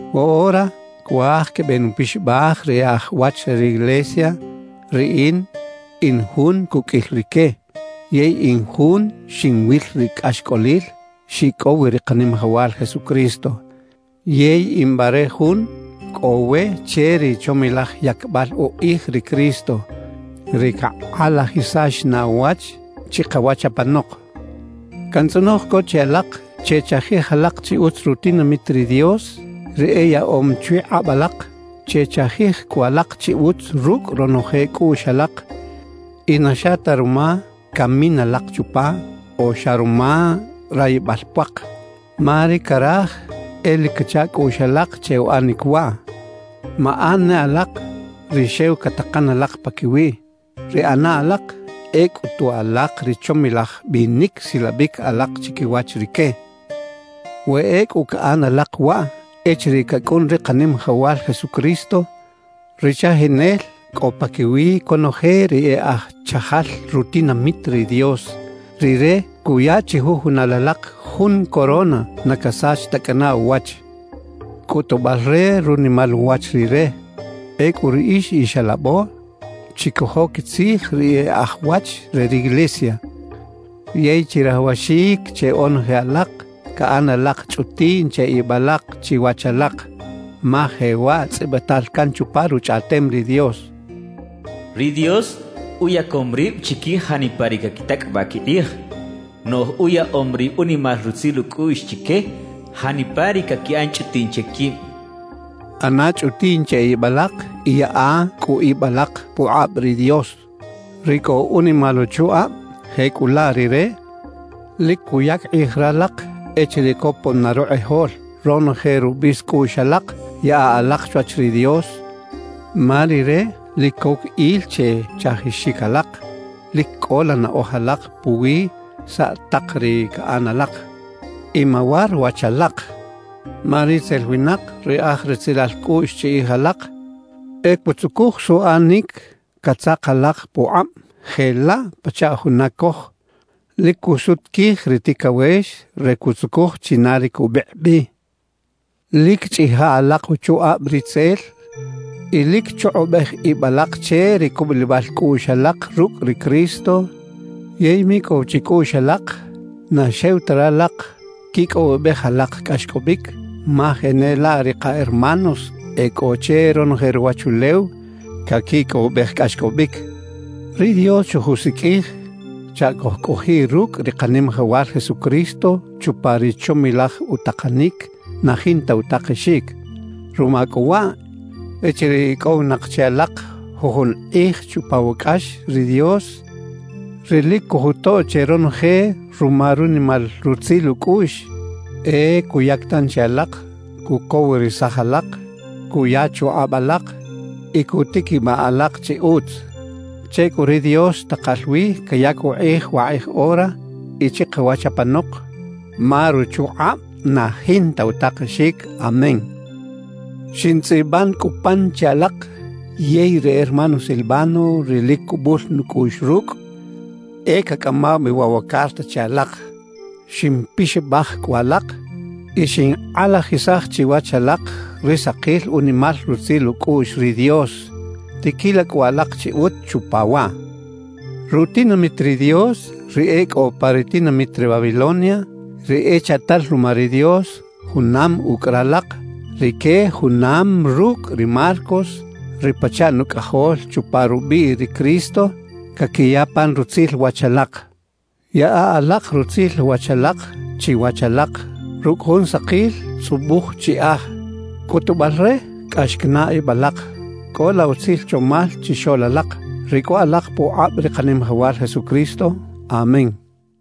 Woꞌora cuaj quebenupixabaj ri e aj wach re riglesia. Riꞌin in jun cuqꞌuil rique, yey in jun xinwil ri cꞌaxcꞌolil xicꞌow wi ri Kanimajawal Jesucristo. Yey in bare jun cꞌo we che ri chomilaj yacbal ukꞌij ri Cristo, ri cakꞌalajisax na uwach chikawach apanok. Cantzꞌonoj co che alak: Chechajij alak chi utz rutinamit ri Dios, ri eyaꞌom chwi kꞌab alak. Chechajij cꞌu alak chi utz rucꞌ ronoje cꞌuꞌx alak y na xa ta ruma camin alak chupa o xa ruma rayibal puak, ma ri caraj e lic cacha cꞌuꞌx alak che uꞌanic waꞌ. Maꞌan ne alak ri xew catakan alak paquiwiꞌ; ri ꞌana alak e cꞌutu alak ri chomilaj binic silabic alak chiquiwach rique. We ecꞌu caꞌan alak waꞌ, echiriꞌ cacꞌun ri Kanimajawal Jesucristo, ri Chajinel cꞌo paquiwi conoje ri e aj chajal rutinamit ri Dios, Rire cuya chijujunal alak jun corona na casach ta cꞌana uwach, cꞌutubal re runimal uwach Rire. Ecꞌu riꞌix ix alabo, chicojo quitzij ri e aj wach re riglesia. Yey chirajawaxic che onoje alak caꞌan alak chꞌutiꞌn che ib alak chiwach alak, ma jewaꞌ tzꞌibital can chupa Ruchꞌaꞌtem ri Dios: Ri Dios uyacom rib chiquij janipa ri caquitacꞌabaꞌ quikꞌij; noꞌj uyaꞌom ri unimal rutzil ucꞌuꞌx chique janipa ri caquiꞌan chꞌutiꞌn che quib cachaꞌ. ꞌAna chꞌutiꞌn che ib alak y yaꞌa cꞌu ib alak pukꞌab ri Dios, ri cꞌo unimal uchukꞌab; jecꞌulaꞌ Rire lic cuyac kꞌij ralak echiriꞌ copon na rukꞌijol. Ronoje rubis cꞌuꞌx alak yaꞌa alak chwach ri Dios, ma Rire lic coc il che chajixic alak. Lic cꞌola naꞌoj alak puwi saꞌ tak ri caꞌan alak y mawar wach alak. Ma ritzel winak, ri aj retzelal cꞌuꞌx chiꞌij alak, e cutzucuj suꞌanic catzak alak pukꞌab jelaꞌ pachaꞌ juna coj lic cusut quij ri ticawex re cutzucuj china ri cubikꞌ bi. Lic chꞌija alak uchukꞌab ritzel y lic chukꞌubej ib alak che ri cubulibal cꞌuꞌx alak rucꞌ ri Cristo. Yey micꞌow chicꞌuꞌx alak na xew ta ralak quicꞌowibej alak cꞌaxcꞌobic, ma jenelaꞌ ri ka hermanos e cꞌo che ronoje ruwachulew caquicꞌowibej cꞌaxcꞌobic. Ri Dios xojusiqꞌuij chaꞌ cojcꞌojiꞌ rucꞌ ri Kanimajawal Jesucristo chupa ri chomilaj utakanic na jinta utakexic. Ruma cꞌu waꞌ, echiriꞌ icꞌowinak chi alak jujun kꞌij chupa wa cꞌax; ri Dios, ri lic cojutoꞌ che ronoje ruma ri unimal rutzil ucꞌuꞌx, e cuyac tanchi alak, cucowirisaj alak, cuya chukꞌab alak y cutiquibaꞌ alak chi utz. Che cꞌu ri Dios takal wi cayac ukꞌij wakꞌij ora y chikawach apanok, ma ruchukꞌab na jinta utakexic. Amén. Xintzꞌiban cꞌu pan che alak; yey ri hermano Silvano, ri lic cubul nucꞌuꞌx rucꞌ, e cacꞌamaw bi waꞌ wa carta che alak. Ximpixabaj cꞌu alak y xinkꞌalajisaj chiwach alak ri sakil unimal rutzil ucꞌuꞌx ri Dios; tiquila cꞌu alak chi utz chupa waꞌ. Rutinamit ri Dios, ri e cꞌo pa ri tinamit re Babilonia, ri echaꞌtal ruma ri Dios junam ucꞌ ralak, rique junam rucꞌ ri Marcos, ri pachaꞌ nucꞌajol chupa rubiꞌ ri Cristo, caquiya pan rutzil wach alak. Yaꞌa alak rutzil wach alak chiwach alak rucꞌ jun sakil tzꞌubuj chiꞌaj, cꞌutubal re cꞌax canaꞌ ib alak. Cꞌola utzil chomal chixoꞌl alak, ri cꞌo alak pukꞌab ri Kanimajawal Jesucristo. Amén.